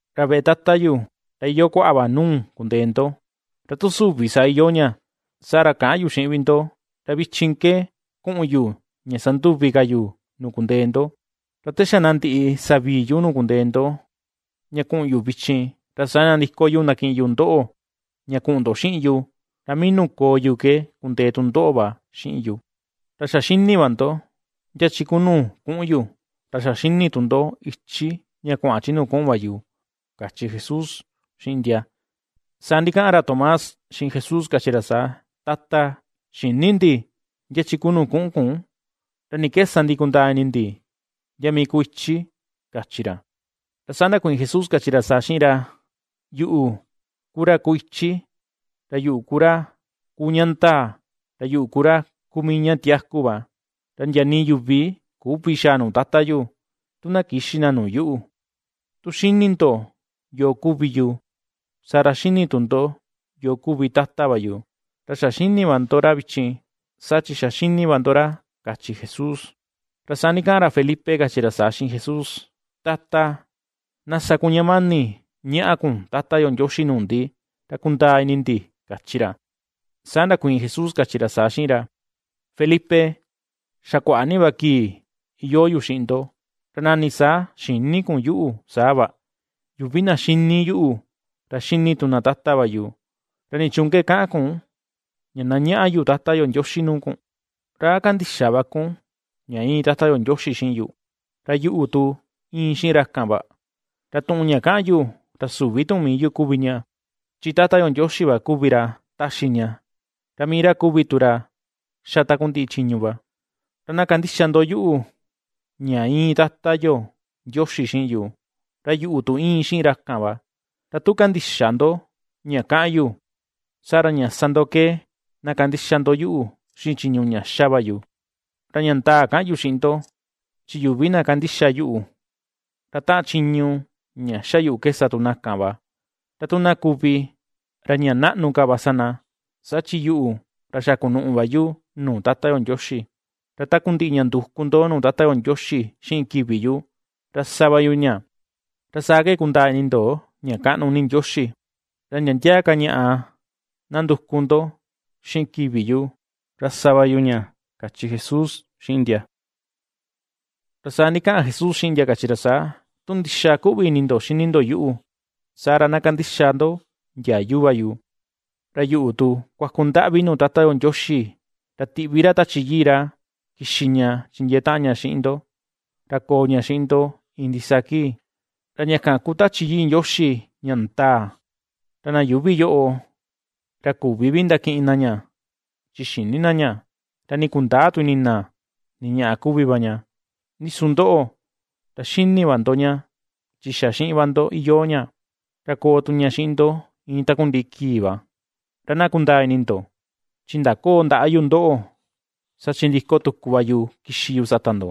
Ra veꞌe Tata yu, ra iyoo kuaꞌa va nuu kundee ndo, ra tu süvi saa iyoo ña, saa ra käꞌan yu xiꞌin vi ndo, ra vichin ke kuꞌun yu ña sanduvi ka yu nuu kundee ndo. Ra te xa na ndiꞌi savii yu nuu kundee ndo ña kuꞌun yu vichin, ra saa nandiko yu ndakiꞌin yu ndoꞌo ña kuꞌun ndo xiꞌin yu, ra mii nuu koo yu ke kundee tu ndoꞌo va xiꞌin yu. Ra ^xa xini va ndo, ndia chi ku nuu kuꞌun yu, ra xa xini tu ndo ichi ña kuaꞌan chi nuu kuꞌun va yu ―kachi Jesús xiꞌin ndia. Saa ndikaꞌan ra Tomás, xiꞌin Jesús kachi ra saa: ―Tata, xïni ndi ndia chi ku nuu kuꞌun kun; ¿ra ni ke sa ndi kundaa ini ndi ndia mii kuu ichi? ―kachi ra. Ra saa ndakuiin Jesús kachi ra saa xiꞌin ra: ―Yuꞌu ku ra kuu ichi, ra yuꞌu ku ra kuu ña ndaa, ra yuꞌu ku ra kuu mii ña tiaku va. Ra ndia nii yuvi küvi xaa nuu Tata yu, tu na kïxi na nuu yuꞌu. Tu xíni̱ ndo yoo kuvi yu, saa ra xíni̱ tu ndo yoo kuvi Tata va yu; ra xa xíni̱ va ndo ra vichin, saa chi xa ^xíní va ndo ra ―kachi Jesús. Ra saa ndikaꞌan ra Felipe, kachi ra saa xiꞌin Jesús: ―Tata, na sa kun ña mani ñaꞌa kun Tata yo Ndioxi nuu ndi, ra kundaa ini ndi ―kachi ra. Saa ndakuiin Jesús kachi ra saa xiꞌin ra: ―Felipe, ¿xa kuaꞌa ni va kii iyoo yu xiꞌin ndo, ra nani saa xïni kun yuꞌu saa va? Yuvi na ^xíní yuꞌu, ra ^xíní tu na Tata va yu; ¿ra nichuun ke kaꞌan kun, ña na ñaꞌa yu Tata yo Ndioxi nuu kun? ¿Ra a kandïxa va kun ña íin Tata yo Ndioxi xiꞌin yu, ra yuꞌu tu íin xiꞌin ra kan va? Ra tuꞌun ña kaꞌan yu, ra süvi tuꞌun mii yu kuvi ña. Chi Tata yo Ndioxi va kuvi ra taxi ña, ra mii ra kuvi tu ra xa takundiꞌi chiñu va. Ra na kandixa ndo yuꞌu, ña íin Tata yo Ndioxi xiꞌin yu, ra yuꞌu tu íin xiꞌin ra kan va; ra tu kandïxa ndo ña kaꞌan yu, saa ra ña sa ndo ke na kandixa ndo yuꞌu xiꞌin chiñu ña ^xa va yu. Ra ña ndaa kaꞌan yu xiꞌin ndo, chi yuvi na kandixa yuꞌu, ra taꞌan chiñu ña ^xa yuꞌu ke sa tu na kan va; ra tu na kuvi, ra ña naꞌnu ka va sa na, saa chi yuꞌu ra xa kunuꞌu va yu nuu Tata yo Ndioxi. Ra takundiꞌi ña nduku ndo nuu Tata yo Ndioxi xiꞌin kivi yu, ra sa va yu ña, ra saa ke kundaa ini ndo ña kaꞌnu ni Ndioxi. Ra ndia ndia ka ñaꞌa na nduku ndo xiꞌin kivi yu, ra sa va yu ña ―kachi Jesús xiꞌin ndia. Ra saa ndikaꞌan Jesús xiꞌin ndia kachi ra saa: ―Tu ndixa kuꞌvi ini ndo xini ndo yuꞌu, saa ra na kandixa ndo ndiayu va yu. Ra yuꞌu tu kuaku ndaꞌvi nuu Tata yo Ndioxi, ra tiꞌvi ra Tachi Yii ra kixi ña chindiee taꞌan ña xiꞌin ndo, ra koo ña xiꞌin ndo iin ndisaa kii. Ra ña kan kuu Tachi Yii Ndioxi ña ndaa. Ra na yuuvi yoꞌo ra ^küvi vi ndakiꞌin na ña chi xïni na ña, ra nii kundäa tu ini na ni ñaꞌa kuvi va ña, ndi su ndoꞌo, ra ^xini va ndo ña, chi xa xiꞌin va ndo iyoo ña, ra koo tu ña xiꞌin ndo iin takundiꞌi kii va. Ra na kundaa ni ndo, chi ndaköo ndaꞌa yu ndoꞌo; saa chi ndiko tuku va yu kixi yu sata ndo.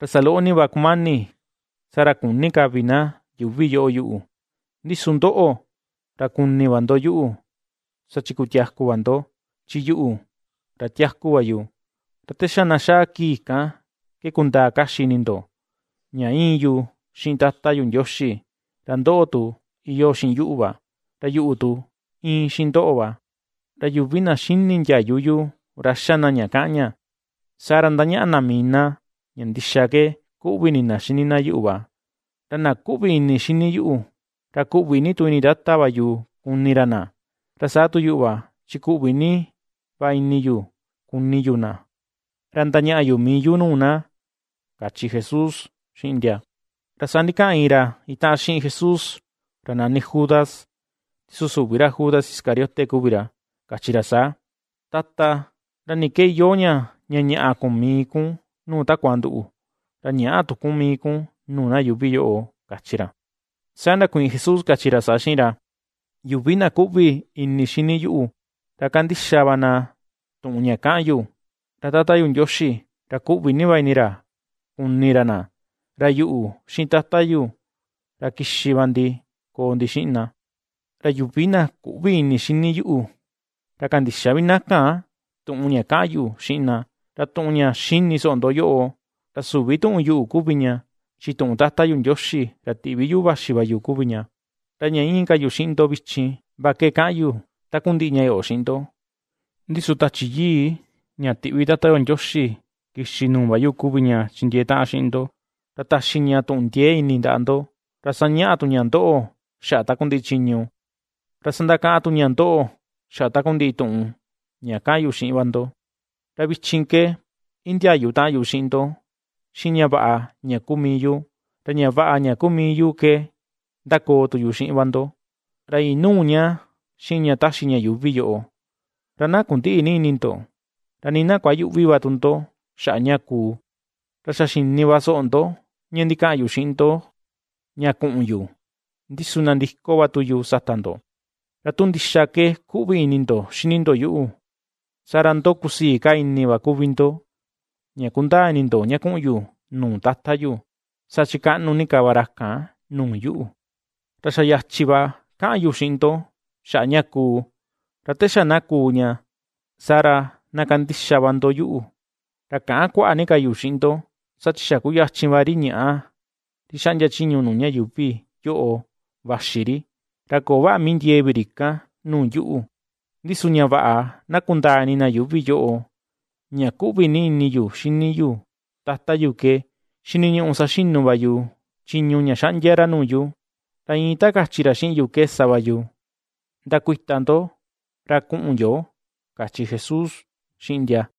Ra saloꞌo ni va kumani, saa ra küni ka vi na yuuvi yoꞌo yuꞌu, ndi su ndoꞌo ra kuni va ndo yuꞌu; saa chi kutiaku va ndo, chi yuꞌu ra tiaku va yu. Ra te xa na xaa kii kan ke kundaa kaxi ini ndo, ña íin yu xiꞌin Tata yu Ndioxi, ra ndoꞌo tu iyoo xiꞌin yuꞌu va, ra yuꞌu tu íin xiꞌin ndoꞌo va. Ra yuvi na xini ndiayu yu, ra xa na ña kaꞌan ña, saa ra, ^ndañaꞌa na mii na ña ndixa ke kuꞌvi ini na xini na yuꞌu va. Ra na kuꞌvi ini xini yuꞌu, ra kuꞌvi ni tu ini Tata va yu kuni ra na, ra saa tu yuꞌu va, chi kuꞌvi ni va ini yu kuni yu na, ra ndañaꞌa yu mii yu nuu na ―kachi Jesús xiꞌin ndia. Ra saa ndikaꞌan iin ra itaꞌan xiꞌin Jesús ra nani Judas (ndi su süvi ra Judas Iscariote kuvi ra) kachi ra saa: ―Tata, ¿ra ni ke iyoo ña, ña ñaꞌa kun mii kun nuu takua nduꞌu, ra ñäꞌa tu kun mii kun nuu na yuuvi yoꞌo? ―kachi ra. Saa ndakuiin Jesús kachi ra saa xiꞌin ra: ―Yuvi na kuꞌvi ini xini yuꞌu, ra kandixa va na tuꞌun ña kaꞌan yu, ra Tata yu Ndioxi, ra kuꞌvi ni va ini ra kuni ra na, ra yuꞌu xiꞌin Tata yu, ra kixi va ndi koo ndi xiꞌin na. Ra yuvi na küꞌvi ini xini yuꞌu, ra kandïxa vi na kan tuꞌun ña kaꞌan yu xiꞌin na. Ra tuꞌun ña xini soꞌo ndo yoꞌo, ra süvi tuꞌun yuꞌu kuvi ña, chi tuꞌun Tata yu Ndioxi ra tiꞌvi yuꞌu vaxi va yu kuvi ña. ’Ra ña íin ka yu xiꞌin ndo vichin va ke kaꞌan yu takundiꞌi ña yoꞌo xiꞌin ndo, ndi su Tachi Yii, ña tiꞌvi Tata yo Ndioxi kixi nuu va yu kuvi ña chindiee taꞌan xiꞌin ndo, ra taxi ña tuꞌun ndiee ini ndaꞌa ndo, ra sañaꞌa tu ña ndoꞌo xaꞌa takundiꞌi chiñu, ra sandakaꞌan tu ña ndoꞌo xaꞌa takundiꞌi tuꞌun ña ^kaꞌan yu xiꞌin va ndo. ’Ra vichin ke, indiayu taꞌan yu xiꞌin ndo xiꞌin ña vaꞌa ña kuu mii yu. Ra ña vaꞌa ña kuu mii yu ke ndakoo tu yu xiꞌin va ndo, ra inüu ña xiꞌin ña taxi ña yuuvi yoꞌo. Ra na kundïꞌi ni ini ndo, ra nii na kuayüꞌvi va tu ndo xaꞌa ña kuu. Ra xa xini va soꞌo ndo, ña ndikaꞌan yu xiꞌin ndo ña kuꞌun yu, ndi su nandiko va tu yu sata ndo. Ra tu ndixa ke kuꞌvi ini ndo xini ndo yuꞌu, saa ra ndo kusii ka ini va kuvi ndo, ña ^kundaa ini ndo ña kuꞌun yu nuu Tata yu, saa chi kaꞌnu ni ka va ra kan nuu yuꞌu. Ra xa yachi va kaꞌan yu xiꞌin ndo xaꞌa ña kuu; ra te xa na kuu ña, saa ra na kandixa va ndo yuꞌu. ’Ra käꞌan kuaꞌa ni ka yu xiꞌin ndo; saa chi xa kuyachin va ri ñaꞌa, ri xaꞌndia chiñu nuu ña yuuvi yoꞌo vaxi ri. Ra köo vaꞌa mii ndiee vi ri kan nuu yuꞌu, ndi su ña vaꞌa na kundaa ini na yuuvi yoꞌo, ña kuꞌvi ni ini yu xini yu Tata yu ke xiniñuꞌu saxinu va yu chiñu ña xaꞌndia ra nuu yu, ra iin ta kachi ra xiꞌin yu ke sa va yu. Ndakuita ndo. Ra kuꞌun yo ―kachi Jesús xiꞌin ndia.